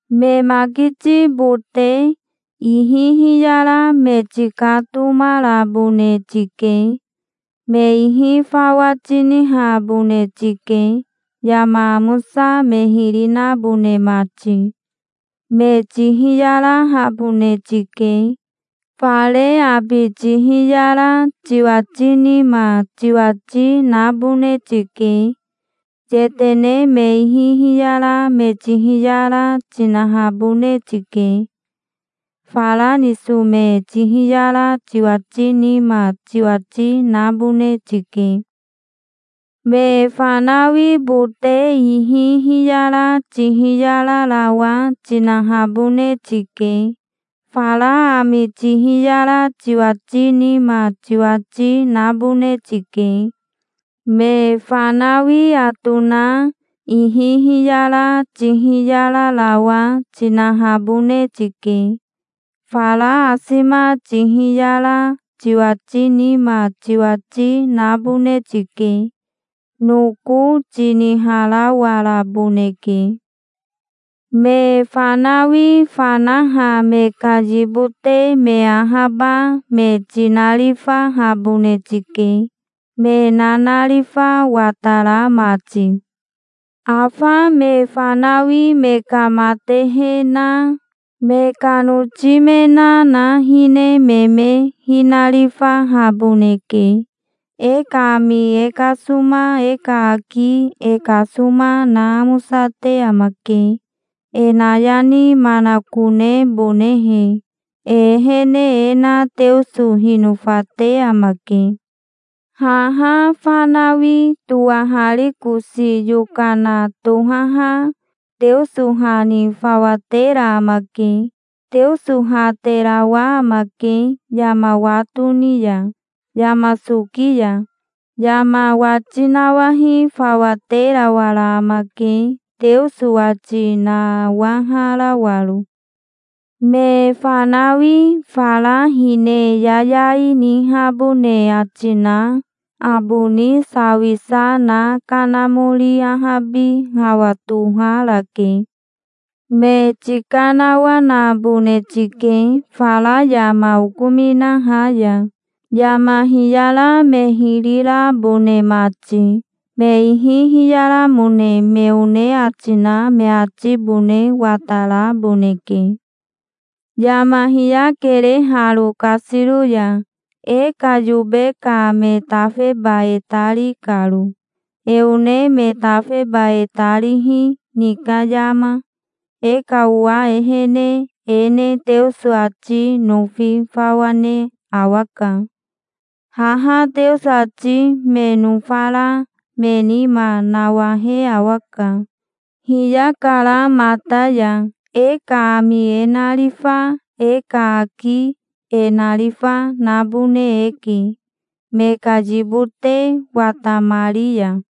Me makiti bote ihi hiyara me tikatomarabone tike. Me ihi fawa tinihabone tike, yama amosa me hiri nabone mati. Me tihiyarahabone tike. Fare abi tihiyara tiwati nima tiwati nabone tike. Yetene me ihi hiyara me tihiyara tinahabone tike. Fara niso me tihiyara tiwati nima tiwati nabone tike. Me fanawi bote ihi hiyara tihiyararawa tinahabone tike. Fara ami tihiyara tiwati nima tiwati nabone tike. Me fanawi atona ihi hiyara tihiyararawa tinahabone tike. Fara asima tihiyara tiwati nima tiwati nabone tike. Noko tiniharawaraboneke. Me fanawi fanaha me ka yibote me ahaba me tinarifahabone tike, me nanarifa watara mati. Afa me fanawi me ka matehe na, me ka noti me na, na hine me me hinarifahaboneke. E ka ami e kasoma, e ka aki e kasoma, na amosate amake, e nayani manakonebonehe. E ehene e na Teoso hinofate amake. Haha fanawi towaharikosi yokana tohaha Teoso ha ni fawa tera amake. Teoso ha terawa amake, yama wa toni ya, yama soki ya. Yama wati nawahi fawa terawara amake, Teoso wati nawaharawaro. Me fanawi fara hine yayai nihabone ati na aboni sawisa na kanamori ahabi hawa toharake. Me tikanawanabone tike fara yama okominaha ya, yama hiyara me hiri rabone mati. Me ihi hiyaramone me one ati na me atibone wataraboneke. Yama hiyakere haro kasiro ya, e ka yobe ka me tafeba e ta ri karo, e one me tafeba e ta rihi ni ka yama. E ka owa ehene e ne Teoso ati nofi fawa ne awaka. Haha Teoso ati me nofara me nima nawahe awaka. Hiyakara mata ya. E ka ami e narifa, e ka aki e narifa, nabone eke, me ka yibote watamari ya.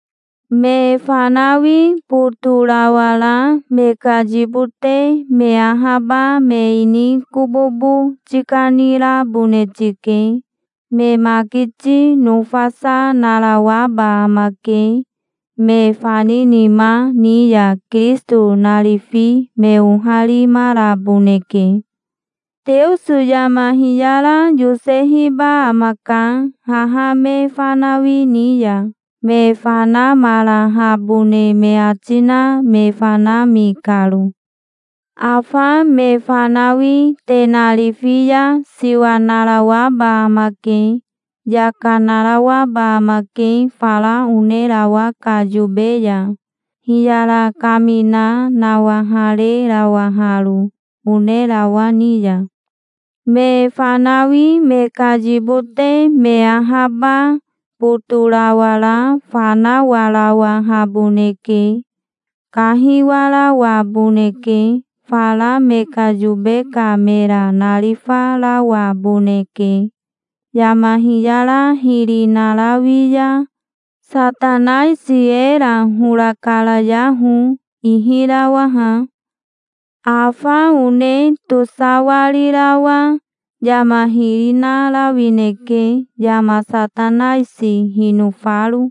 Me fanawi botorawara me ka yibote me ahaba me ini kobobo tikanirabone tike. Me makiti nofasa narawaba amake. Me faninima ni ya Kirisito narifi me oharimaraboneke. Teoso yama hiyara yosehiba amaka haha me fanawi ni ya, me fanamarahabone me ati na me fanami karo. Afa me fanawi te narifi ya siwa narawaba amake. Yaka narawaba amake fara onerawa ka yobe ya, hiyara kamina nawaharerawaharo onerawa ni ya. Me fanawi me ka yibote me ahaba botorawara fanawarawahaboneke. Kahiwarawaboneke. Fara me ka yobe ka mera narifarawaboneke. Yama hiyara hiri narawi ya Satanaisi era hora karayaho, ihirawaha. Afa one tosawarirawa yama hiri narawineke yama Satanaisi hinofaro.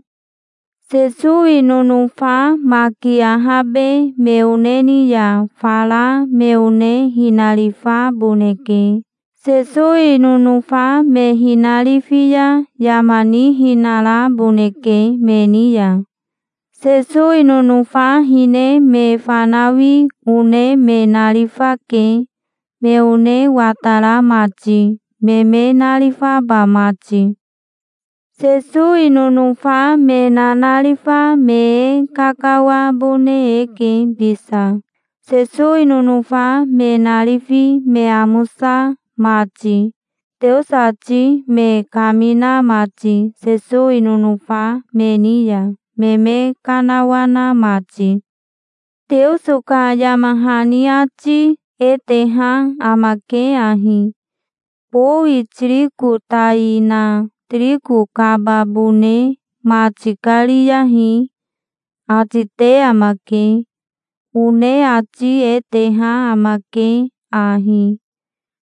Sesowi nonofa maki ahabe me one ni ya fara me one hinarifaboneke. Sesowi nonofa me hinarifi ya yama nihinaraboneke me ni ya. Sesowi nonofa hine me fanawi one me narifake, me one watara mati, me me narifaba mati. Sesowi nonofa me nanarifa me e kakawabone eke bisa, Sesowi nonofa me narifi me amosa mati, Teoso ati me kamina mati Sesowi nonofa me ni ya, me me kanawana mati. Teoso ka yama hani ati e teha amake ahi: "Bowi tiriko tai na tiriko kababone ma tikariyahi", ati te amake. One ati e teha amake ahi: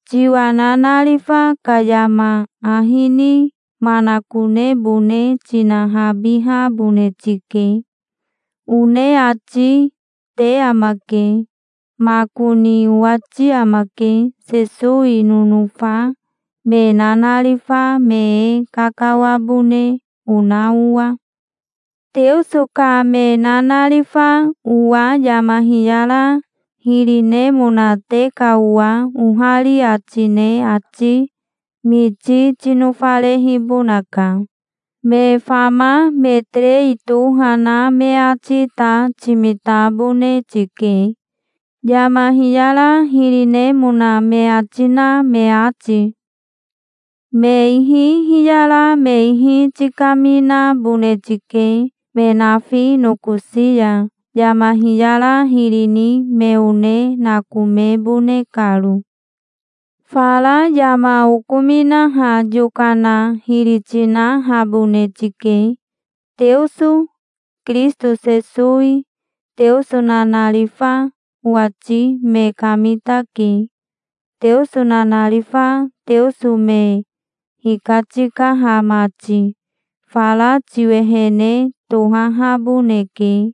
"Tiwa nanarifa ka yama ahi ni manakonebone tinahabihabone tike", one ati te amake. Makoni owati amake, Sesowi nonofa me nanarifa me e kakawabone ona owa. Teoso ka me nanarifa owa yama hiyara hiri nemona te ka owa ohari ati ne ati miti tinofarehibonaka. Me fama me terei toha na me ati ta timitabone tike, yama hiyara hiri nemona me ati na me ati. Me ihi hiyara me ihi tikaminabone tike me nafi nokosi ya, yama hiyara hiri ni me one nakomebone karo. Fara yama okominaha yokana hiri tinahabone tike. Teoso, Kirisito Sesowi, Teoso nanarifa, owati me kamitake, Teoso nanarifa Teoso me hikatikaha mati. Fara tiwehene tohahaboneke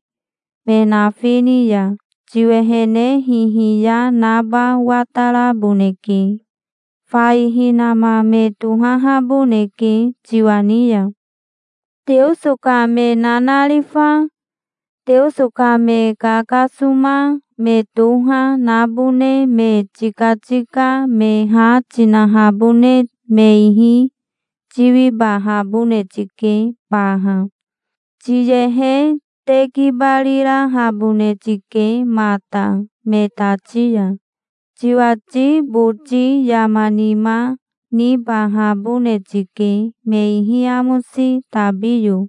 me nafi ni ya. Tiwehene hihiya naba wataraboneke. Fai hinama me tohahaboneke tiwa ni ya. Teoso ka me nanarifa, Teoso ka me kakasoma me toha, nabone me tikatika me ha tinahabone me ihi tiwibahabone tike baha. Tiyehe tekibarirahabone tike mata me tati ya. Tiwati boti yama nima nibahabone tike, me ihi amosi tabiyo.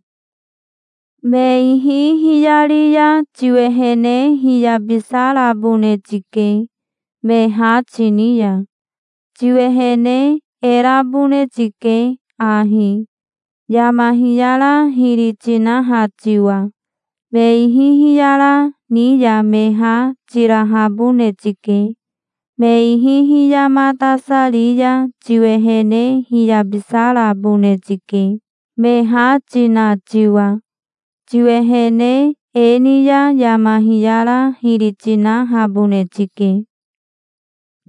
Me ihi hiyari ya tiwehene hiyabisarabone tike, me ha tini ya. Tiwehene e rabone tike ahi, yama hiyara hiri tinaha tiwa. Me ihi hiyara ni ya me ha tirahabone tike. Me ihi hiyamatasari ya tiwehene hiyabisarabone tike, me ha tina tiwa. Tiwehene e ni ya yama hiyara hiri tinahabone tike.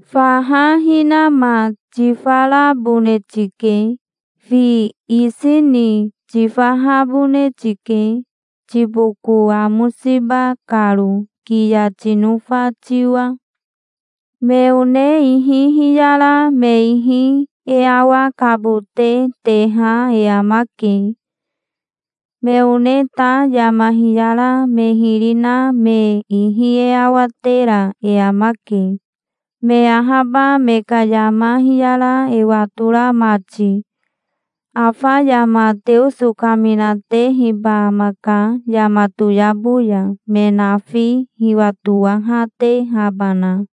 Faha hinama tifarabone tike. Fi isi ni tifahabone tike, tiboko amosiba karo, kiya tinofa tiwa. Me one ihi hiyara me ihi e awakabote teha e amake. Me one ta yama hiyara me hiri na me ihi e awatera e amake, me ahaba me ka yama hiyara e watora mati. Afa yama Teoso kaminatehiba amaka yama toyabo ya me nafi hiwatowahatehabana.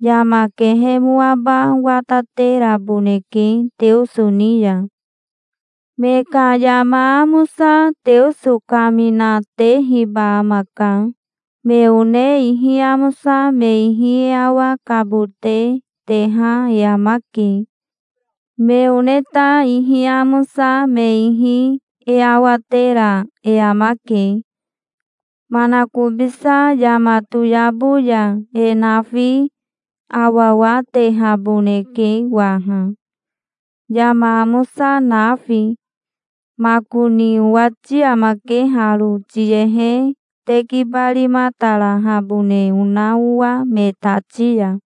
Yama kehemoaba watateraboneke Teoso ni ya. Me ka yama amosa Teoso kamina, tehiba amaka. Me one ihi amosa me ihi e awakabote teha e amake. Me one ta ihi amosa me ihi e awatera e amake. Manakobisa yama toyabo ya e nafi awawatehaboneke waha, yama amosa nafi. Makoni owati amake haro, tiyehe tekibarimatarahabone ona owa me tati ya.